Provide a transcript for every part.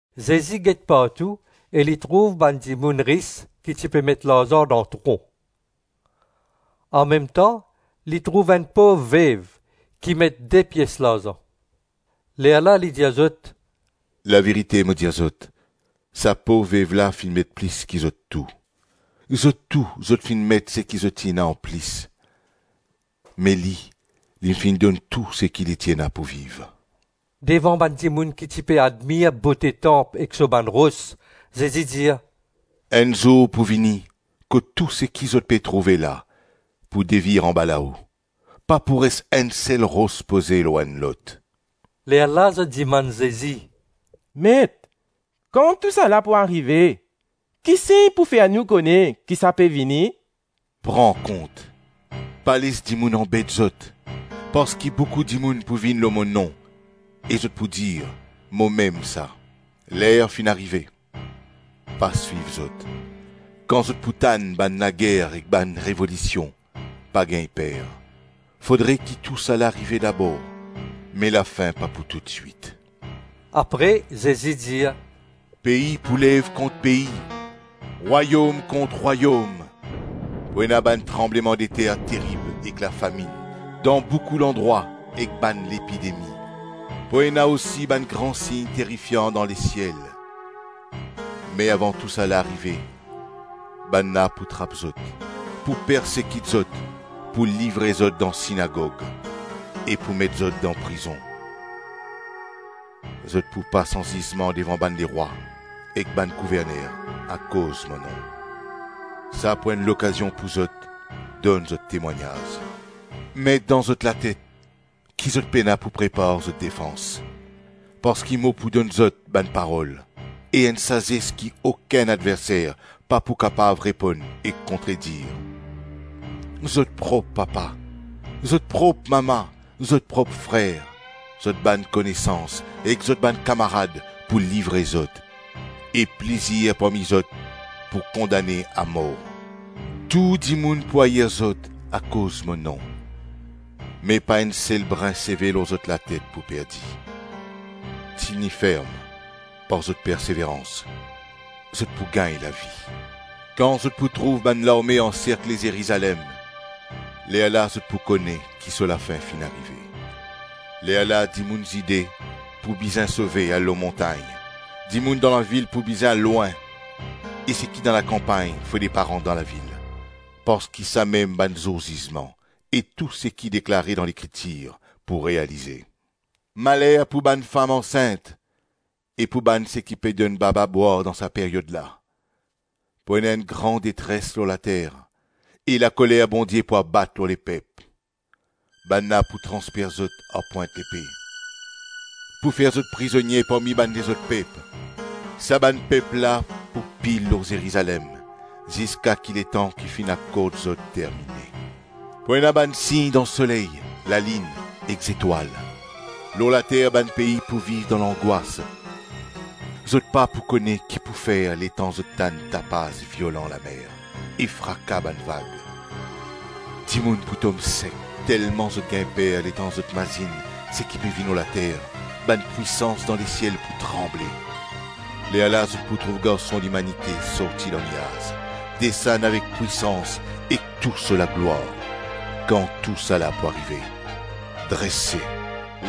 Zezi get partou e li trouv bann dimoun ris ki ti pe met larzan dan tron. Anmemtan, li trouv enn pov vev ki met de pies larzan. Lerla li dir zot, “Laverite, mo dir zot, sa pov vev la finn met plis ki zot tou. Zot tou zot finn met seki zot ti ena anplis me li, li finn donn tou seki li ti ena pou viv.” Devan bann dimoun ki ti pe admir bote tanp ek so bann ros, Zezi dir, “Enn zour pou vini, kot tou seki zot pe trouve la, pou devir anbalao. Pa pou res enn sel ros poze lor enn lot.” Lerla zot dimann Zezi, “Met, kan tousala pou arive? Ki sign pou fer nou kone ki sa pe vini?” “Pran kont, pa les dimoun anbet zot. Parski boukou dimoun pou vinn lor mo nom e zot pou dir, ‘Momem sa.’ ‘Ler finn arive’. Pa swiv zot. Kan zot pou tann bann lager ek bann revolision, pa gagn per; fodre ki tousala arive dabor, me lafin pa pou toutswit.” Apre Zezi dir, “Pei pou lev kont pei, rwayom kont rwayom. Pou ena bann tranblemandeter terib ek lafaminn dan boukou landrwa ek bann lepidemi; pou ena osi bann gran sign terifian dan lesiel. Me avan tousala arive, bannla pou trap zot, pou persekit zot, pou livre zot dan sinagog e pou met zot dan prizon; zot pou pas anzizman devan bann lerwa ek bann gouverner akoz mo nom. Sa pou enn lokazion pou zot donn zot temwagnaz. Met dan zot latet ki zot pena pou prepar zot defans. Parski mo pou donn zot bann parol e enn sazes ki okenn adverser pa pou kapav reponn ek kontredir. Zot prop papa, zot prop mama, zot prop frer, zot bann konesans ek zot bann kamarad pou livre zot, e plizir parmi zot pou kondane amor. Tou dimoun pou air zot akoz mo nom. Me pa enn sel brin seve lor zot latet pou perdi. Tini ferm par zot perseverans, zot pou gagn lavi.” “Kan zot pou trouv bann larme anserkle Zerizalem, lerla zot pou kone ki so lafin finn arive. Lerla dimoun Zide pou bizin sove al lor montagn, dimoun dan lavil pou bizin al lwin, e seki dan lakanpagn fode pa rant dan lavil. Parski samem bann zour zizman, e tou seki deklare dan lekritir pou realize. Maler pou bann fam ansint e pou bann seki pe donn baba bwar dan sa peryod la; pou ena enn gran detres lor later e lakoler Bondie pou abat lor lepep. Bannla pou transpers zot ar pwint lepe, pou fer zot prizonie parmi bann lezot pep; sa bann pep la pou pil lor Zerizalem ziska ki letan ki finn akord zot termine. Pou ena bann sign dan soley, lalinn ek zetwal; lor later bann pei pou viv dan langwas; zot pa pou kone ki pou fer letan zot tann tapaz violan lamer e fraka bann vag. Dimoun pou tom sek telman zot gagn per letan zot mazinn seki pe vinn lor later; bann pwisans dan lesiel pou tranble. Lerla zot pou trouv Garson Limanite sorti dan niaz, desann avek pwisans ek tou so laglwar. Kan tousala pou arive, drese,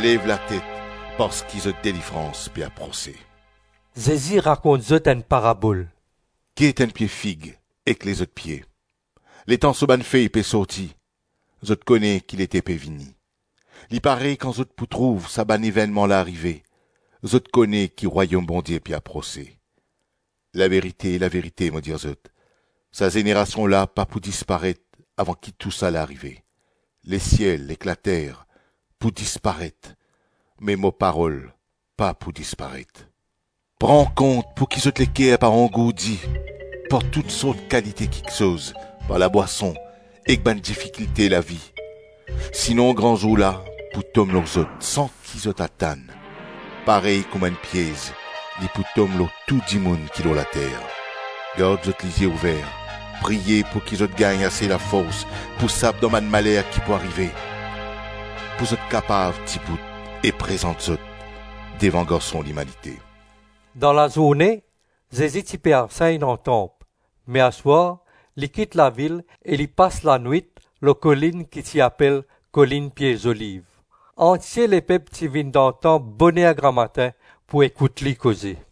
lev latet parski zot delivrans pe aprose.” Zezi rakont zot enn parabol, “Get enn pie fig ek lezot pie; letan so bann fey pe sorti, zot kone ki lete pe vini. Li parey kan zot pou trouv sa bann evennman la arive; zot kone ki Rwayom Bondie pe aprose. Laverite, laverite mo dir zot, sa zenerasion la pa pou disparet avan ki tousala arive. Lesiel ek later pou disparet me mo parol pa pou disparet.” “Pran kont pouki zot leker pa angourdi par tousort kalite kiksoz, par labwason ek bann difikilte lavi, sinon Gran Zour la pou tom lor zot san ki zot atann, parey kouma enn piez; li pou tom lor tou dimoun ki lor later. Gard zot lizie ouver, priye pouki zot gagn ase lafors pou sap dan bann maler ki pou arive, pou zot kapav dibout e prezant zot devan Garson Limanite.” Dan lazourne, Zezi ti pe ansegn dan tanp me aswar, li kit lavil e li pas lanwit lor kolinn ki ti apel Kolinn Pie Zoliv. Antie lepep ti vinn dan tanp boner gramatin pou ekout li koze.